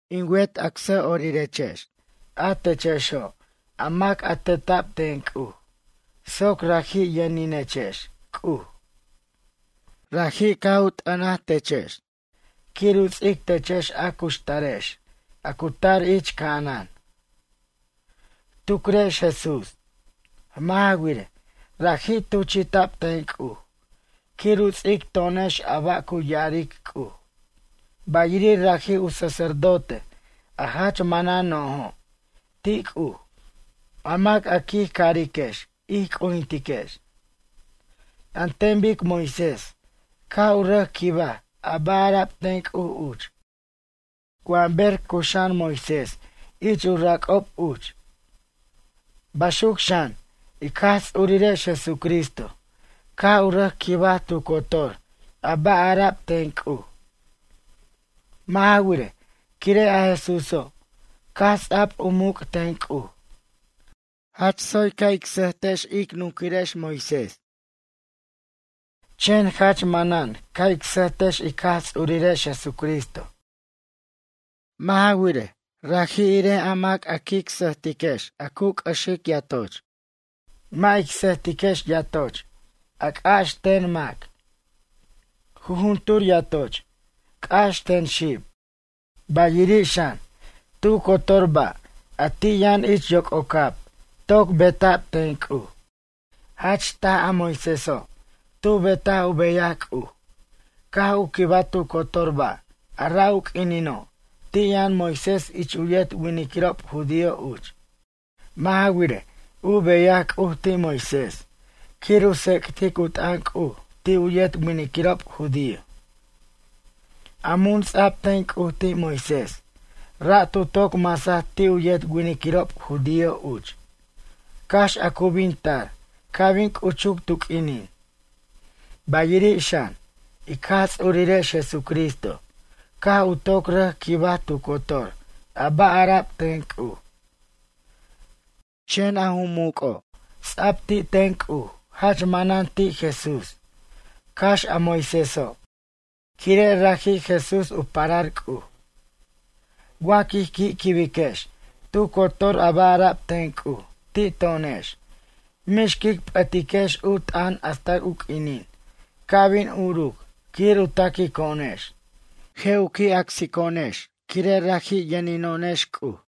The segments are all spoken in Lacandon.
In wet acsʌ'orirex a techexo' a mac a teta'b ten C'uj soc raji' yʌninechex C'uj. Raji' caj u t'ʌn techex quir u ts'ic techex a cuxtarex a cu tar ich ca'anan. Tucrex Jesús. Mʌ' ja wirej, raji' tuchi'ta'b ten C'uj quir u ts'ic to'onex a ba' cu ya'aric C'uj, bayiri' raji' u sacerdote a jach manan no'jo' ti' C'uj a mac a quij cariquex ij c'ujintiquex. An ten bic Moisés caj u rʌc quibaj a ba' ara'b ten C'uj uch wa ber caj cuxa'an Moisés ich u rac'ob uch. Baxuc xan, ic Jaj Ts'urirex Jesucristo caj u rʌc quibaj tu cotor a ba' ara'b ten C'uj. Mʌ' ja wirej, quire' a Jesúso' caj ts'a'b u muc' ten C'uj. Jach tsoy ca' ic sʌjtiquex ic nunquirex Moisés, chen jach manan ca' ic sʌjtex ic Jaj Ts'urirex Jesucristo. Mʌ' ja wirej, raji' irej a mac ic sʌjtiquex a cu c'ʌxic yatoch, mʌ' ic sʌjtiquex yatoch a c'ax ten mac. Jujuntur yatoch c'ax ten xib. Bayiri' xan, tu cotor ba' a ti' yʌn ich yoc'ocab toc beta'b ten C'uj. Jach taj a Moiséso' tu betaj u beyaj C'uj, caj u quibaj tu cotor ba' a ra' u q'uinino' ti' yʌn Moisés ich u yet winiquirob judío uch. Mʌ' ja wirej, u beyaj C'uj ti' Moisés quir u tsec'tic u t'ʌn C'uj ti' u yet winiquirob judío. A mun ts'a'b ten C'uj ti' Moisés ra' tu toc masaj ti' u yet winiquirob judío uch cax a cu bin tar ca' bin c'uchuc tu q'uinin. Bayiri' xan, ic Jaj Ts'urirex Jesucristo caj u toc rʌc quibaj tu cotor a ba' ara'b ten C'uj. Chen ju muc'o' ts'a'b ti' ten C'uj jach manan ti' Jesús cax a Moiséso', quire' raji' Jesús u parar C'uj. Wa quij qui' quibiquex tu cotor a ba' ara'b ten C'uj ti' to'onex mix quic p'ʌtiquex u t'ʌn hasta u q'uinin ca' bin uruc quir u taquico'onex, je' u qui' acsico'onex quire' raji' yʌnino'onex C'uj.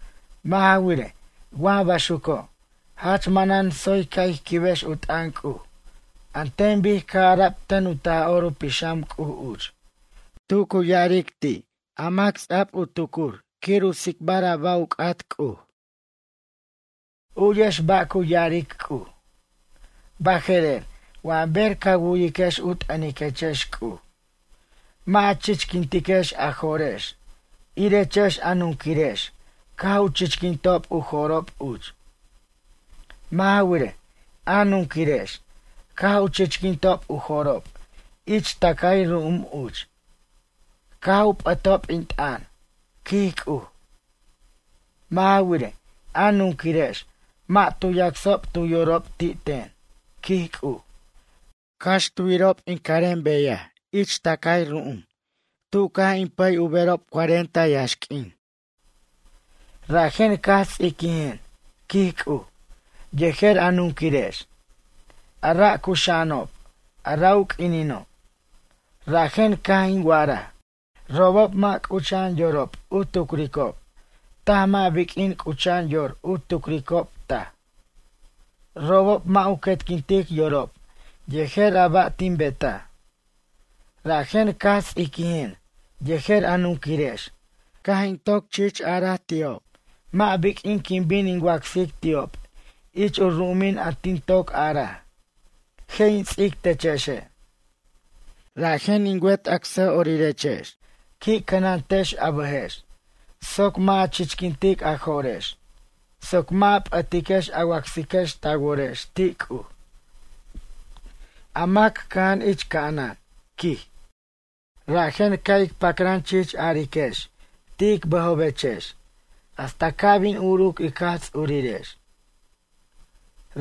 Mʌ' ja wirej, wa baxuco', jach manan tsoy ca' ij quibex u t'ʌn C'uj an ten bic caj ara'b ten u Taj'or u Pixam C'uj uch, tu cu ya'aric ti' a mac ts'a'b u tucur quir u tsicbar a ba' u c'at C'uj. U'yex ba' cu ya'aric C'uj: Baje'rer wa ber ca wu'yiquex u t'ʌniquechex C'uj. Mʌ' a chichquintiquex a jo'rex irechex a nunquirex caj u chichquintob u jo'rob uch. Mʌ' ja wirej, a nunquirex caj u chichquintob u jo'rob ich tʌcay ru'um uch, caj u p'ʌtob in t'ʌn, quij C'uj. Mʌ' ja wirej, a nunquirex mʌ' tu yacsob tu yorob ti' ten, quij C'uj, cax tu yirob in carem beyaj ich tʌcay ru'um tu caj in pʌy u berob cuarenta yaxq'uin. Rajen caj ts'iquijen, quij C'uj, yejer a nunquirex, a ra' cuxa'anob a ra' u q'uinino'. Rajen caj in wa'araj: Robob mʌ' c'ucha'an yorob u tucricob taj mʌ' biq'uin c'ucha'an yor u tucricob taj, robob mʌ' u quetquintic yorob yejer a ba' tin betaj. Rajen caj ts'iquijen yejer a nunquirex caj in toc chich araj ti'ob mʌ' biq'uin quin bin in wacsic ti'ob ich u ru'umin a tin toc araj: Je' in ts'ic techexe'. Rajen in wet acsʌ'orirex, qui' cʌnantex a bʌjex soc mʌ' a chichquintic a jo'rex soc mʌ' a p'ʌtiquex a wacsiquex ta worex ti' C'uj, a mac cʌja'an ich ca'anan, quij. Rajen ca' ic pacran chich ariquex ti' ic bʌjobechex hasta ca' bin uruc ic Jaj Ts'urirex.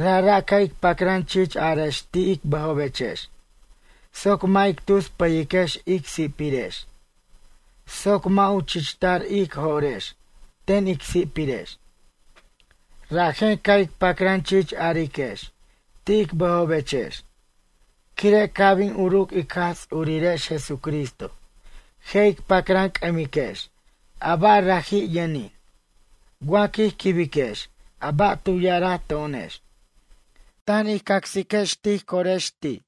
Rajra' ca' ic pacran chich arex ti' ic bʌjobechex soc mʌ' ic tus pʌyiquex ic si'pirex soc mʌ' u chichtar ij jo'rex ten ic si'pirex. Rajen ca' ic pacran chich ariquex ti' ic bʌjobechex. Quire' ca' bin uruc ic Jaj Ts'urirex Jesucristo je' ic pacran c'ʌmiquex a ba' raji' yʌnin, wa quij quibejex a ba' tu ya'araj to'onex, tan ij cacsiquex tij corex ti'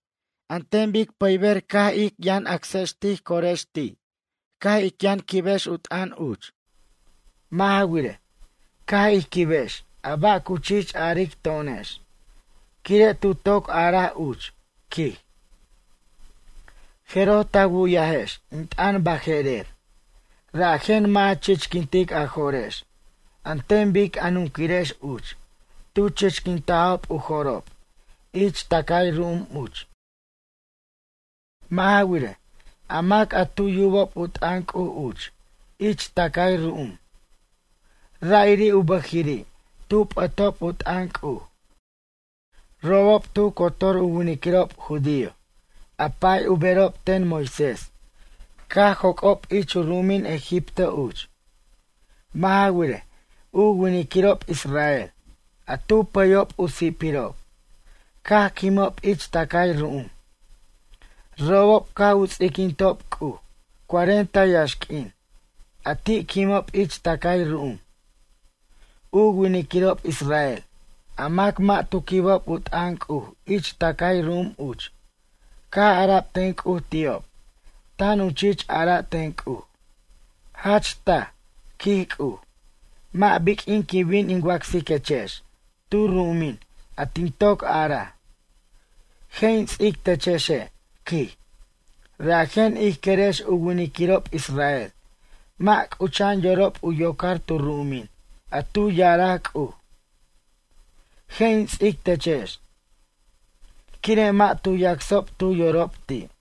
an ten bic pʌyber caj ij yʌn acsex tij corex ti' caj ic yʌn quibex u t'ʌn uch. Mʌ' ja wirej, ca' ij quibex a ba' cu chich aric to'onex, quire' tu toc araj uch, quij: Jeroj ta wu'yajex in t'ʌn baje'rer, rajen mʌ' a chichquintic a jo'rex an ten bic a nunquirex uch tu chichquintajob u jo'rob ich tʌcay ru'um uch. Mʌ' ja wirej, a mac a tu yubob u t'ʌn C'uj uch ich tʌcay ru'um. Ra'iri' u bʌjiri' tu p'ʌtob u t'ʌn C'uj. Robob, tu cotor u winiquirob judío a pa'y u berob ten Moisés caj joc'ob ich u ru'umin Egipto uch. Mʌ' ja wirej, u winiquirob israel, a tu pʌyob u si'pirob, caj quimob ich tʌcay ru'um. Robob caj u ts'iquintob C'uj cuarenta yaxq'uin a ti' quimob ich tʌcay ru'um. U winiquirob israel a mac mʌ' tu quibob u t'ʌn C'uj ich tʌcay ru'um uch caj ara'b ten C'uj ti'ob tan u chich ara' ten C'uj: “Jach taj, quij C'uj, mʌ' biq'uin quin bin in wacsiquechex tu ru'umin a tin toc araj: Je' in ts'ic techexe', quij.” Rajen ij querex u winiquirob israel mʌ' c'ucha'an yorob u yocar tu ru'umin a tu ya'araj C'uj: Je' in ts'ic techex. Quire' mʌ' tu yacsob tu yorob ti'.